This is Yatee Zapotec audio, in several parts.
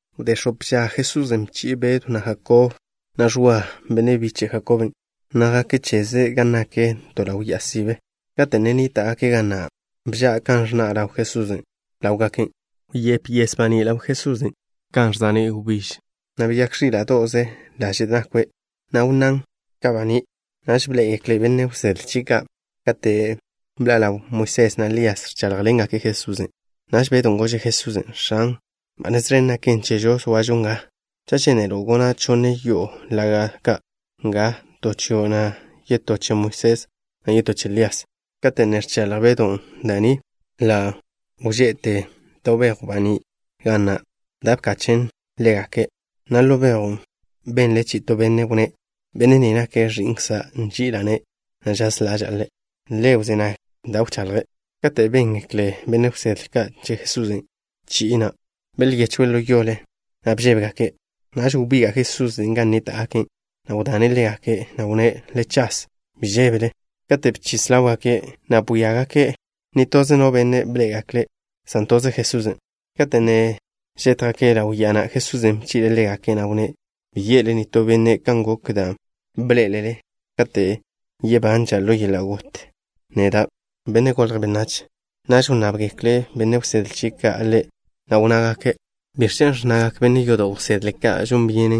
Wdé x̱ope ža, Jesusen' bchi'e Bedw na' Jakob, na' Ẕwa, benne' biche' Jakoben', na' jake' cheze gan nak to ḻaw ya'a sibe. Kate' ne nníta'gake' ga na' bža' kan ẕnna' ḻaw Jesusen' ḻáwgake'. Wyép yes baní' ḻaw Jesusen' kan ža'ní' wbíž, na' beyák ẕíla'do'ze laže' nakwe', na' wnnán' ka baní'. Naž bḻé'egekle benne' wsedle chie' ka' kate' bḻa' ḻawgak Moisés na' Lías, ẕcháḻjḻengake' Jesusen'. Naž Bedon' gože' Jesusen': —X̱an, ba nez ẕen naken chežo zoažo nga. Cha' žénelo', gona' chonne yo'o laga' ka' nga, to chio', na' yetó che Moisés, na' yetó che Lías. Kate' ne ẕchaḻj Bedon' da' ni, ḻa' wže'te to bejw baní' ga na', da' bkachen' ḻégake', na' ḻo bejwn' benle chi'i to benne' wnné': —Benne' ni nake' Ẕi'nkza'. Nži'ila'-ne', na' žaz ḻaža'a Ḻe'. Le wzé nag da' wchaḻje'. Kate' béngekle benne' wsedle ka' che Jesusen' chi'i na', belyechwe' ḻo yole, na' bžébegake'. Naž wbiga' Jesusen' gan nníta'gake', na' wdane' ḻégake', na' wnné': —Le chas. Bi žébele. Kate' bchis ḻáwgake', na' bwíagake', nitože no benne' bḻé'egekle', san toze Jesusen'. Kate' ne žétjgake' ḻaw ya'a na', Jesusen' bchi'le' ḻégake', na' wnné': —Bi ye'le nitó benne' kan gok dan' bḻé'elele kate' yebanža' ḻo yeḻa' got neda', Benne' Golje' Benách. Naž wnnábgekle benne' wsedle chie' ka' Ḻe', na' wnnágake': —¿Biẕ chen' ẕnnagak benne' yodo' wsedle ka' žon byene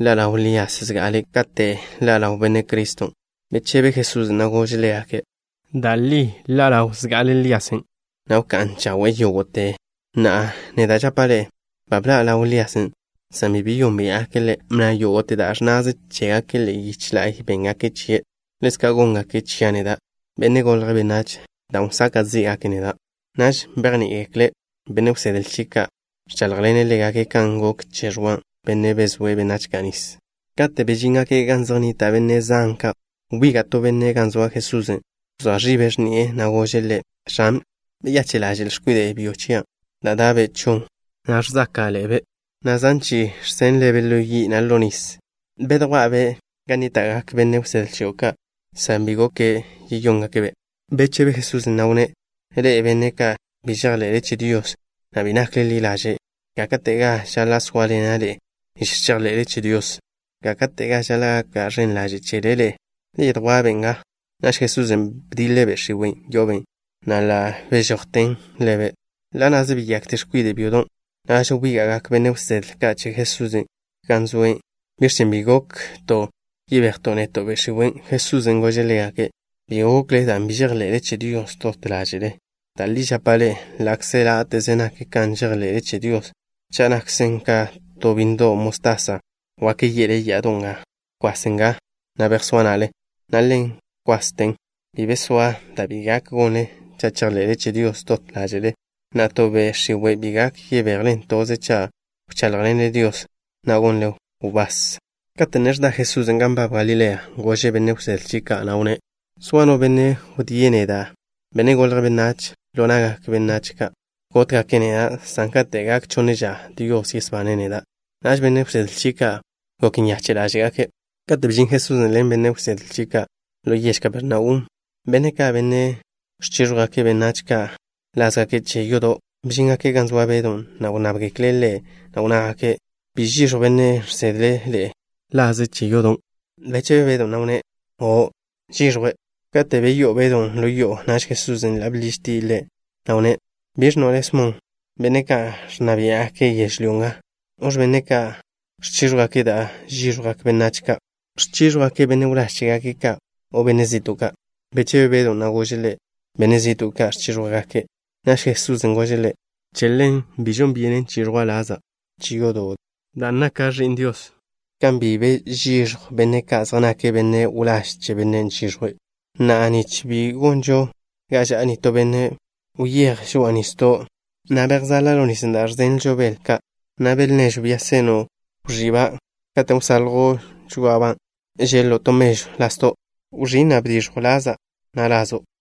ḻa' ḻaw Lías zga'ale' kate' ḻa' ḻaw Benne' Criston'? Bechebe Jesusen', na' gože' ḻégake': —Da' li ḻa' ḻaw zga'ale Líasen', na' wká'n chawe'e yógo'te. Na'a neda' žapa' ḻe'e: ba bḻa' ḻaw Líasen', san bi beyónbia'gake' ḻe', na' yógo'te da' ẕnnaze chégake' ḻe'e yiche la'y béngake' chie'. Ḻezka' góngake' chia' neda', Benne' Golje' Benách, dan' wsaka' zí'gake' neda'. Naž bejní'igekle benne' wsedle chie' ka', ẕcháḻjḻene' ḻégake' kan gok che Ẕwa, bennen' bezóe' benách ka' nis. Kate' bežíngake' gan zej nnita' benne' zan ka', wbiga' to benne' gan zoa Jesusen'. Bzoa ẕibe' x̱ni'e, na' gože' Ḻe': —X̱an, beyache' ḻaže'l x̱kwide' byo chia', dan' da'be' chon, na' ẕzáka'ḻe'ebe', na' zan chi'i ẕže'be' ḻo yi', na' ḻo nis. Bedjwá'a-be' gan nníta'gak benne' wsedle chio' ka', san bi gok yeyóngake'-be'. Bechebe Jesusen', na' wnné': —Ḻe'e, benne' ka' bi žejḻe'le che Dios, na' bi nakle ḻi ḻaže'. ¿Gáka'tega žaḻa' sóaḻena' ḻe'e nich chejḻe'le che Dios? ¿Gáka'tega žaḻa' gaka' ẕen ḻaže' chele ḻe'e? Le yedjwá'-be' nga. Naž Jesusen' bdiḻe' be' x̱iwen' yo'obe', na' ḻa' bežojten ḻebe', na' ḻa' na'ze beyakte x̱kwide' byodon'. Naž wbíga'gak benne' wsedle ka' che Jesusen' gan zoe' cheze. Wnnábgekle' Ḻe', na' wnnágake': —¿Biẕ chen' bi gok yebejto' neto' be' x̱iwen'? Jesusen' gože' ḻégake': —Bi gokle dan' bi žejḻe'le che Dios dot ḻáže'le. Da' li žapa' ḻe'e, ḻa'kze láte'ze nak kan žejḻe'le che Dios, cha' nakzen ka to bínnedo' mostasa, wak ye'le ya'ado' nga: “Bkwas nga, na' bejsóa na'le” na' ḻa' wkwasten. Bi be zoa da' bi gak gonle cha' chejḻe'le che Dios dot ḻáže'le. Na'a, to be' x̱iwe' ki gak yebejlen toze cha' wcháḻjḻenle Dios, na' gonle wbás. Kate' ne ẕda Jesusen' gan nbab Galilea, gože' benne' wsedle chie' ka', na' wnné': —Zoa no benne' wdíe' neda', Benne' Golje' Benách, ḻo na'gak benách ka'. Gótgake' neda', san kate' gak chonne ža Dios yesbane' neda'. Naž benne' wsedle chie' ka' gok nyache' ḻáže'gake'. Kate' bžin Jesusen' ḻen benne' wsedle chie' ka' ḻo yež Kapernaum, benne' ka', benne' ẕchíẕjwgake' benách ka' lázgake' che yodo', bžíngake' gan zoa Bedw, na' wnnábgekle' ḻe', na' wnnágake': —¿Bi žiẕjw bennen' žsedle' ḻe'e laze' che yodo'? Bechebe Bedon', na' wnné': —O', žiẕjwe'. Kate' beyó'o Bedon' ḻo yo'o, naž Jesusen' ḻa' bḻižtie' ḻe', na' wnné': —¿Biẕ ẕnno' le', Smon? Benne' ka' ẕnna biá'gake' yežlyó nga, ¿noẕ benne' ka' ẕchíẕjwgake' da' žíẕjwgak benách ka'? ¿Ẕchíẕjwgake' benne' wláž chégake' ka' o benne' zi'to' ka'? Bechebe Bedon', na' gože' Ḻe': —Benne' zi'to' ka ẕchíẕjwgake'. Naž Jesusen' gože' ḻe': —Che ḻen, bi žon byenen chiẕjwa' laza' che yodo' dan' naka' Ẕi'n Dios, kan bi be žíẕjwgak benne' ka' zej nake' benne' wláž che bennen' ẕchiẕjwe'. Na'a, nich bi gonžo ga ža'a nitó benne', wyéj žoa'a nisdo', na' bejzale ḻo nisen' dan' ẕzenlo' bel ka', na' bel nežw da' seno', wẕí'-ban'. Kate' wsaljo' žoá'aba', žeḻ-lo' to mežw lasdo'. Wẕín', na' bdiẕjw laza', na' lazo'.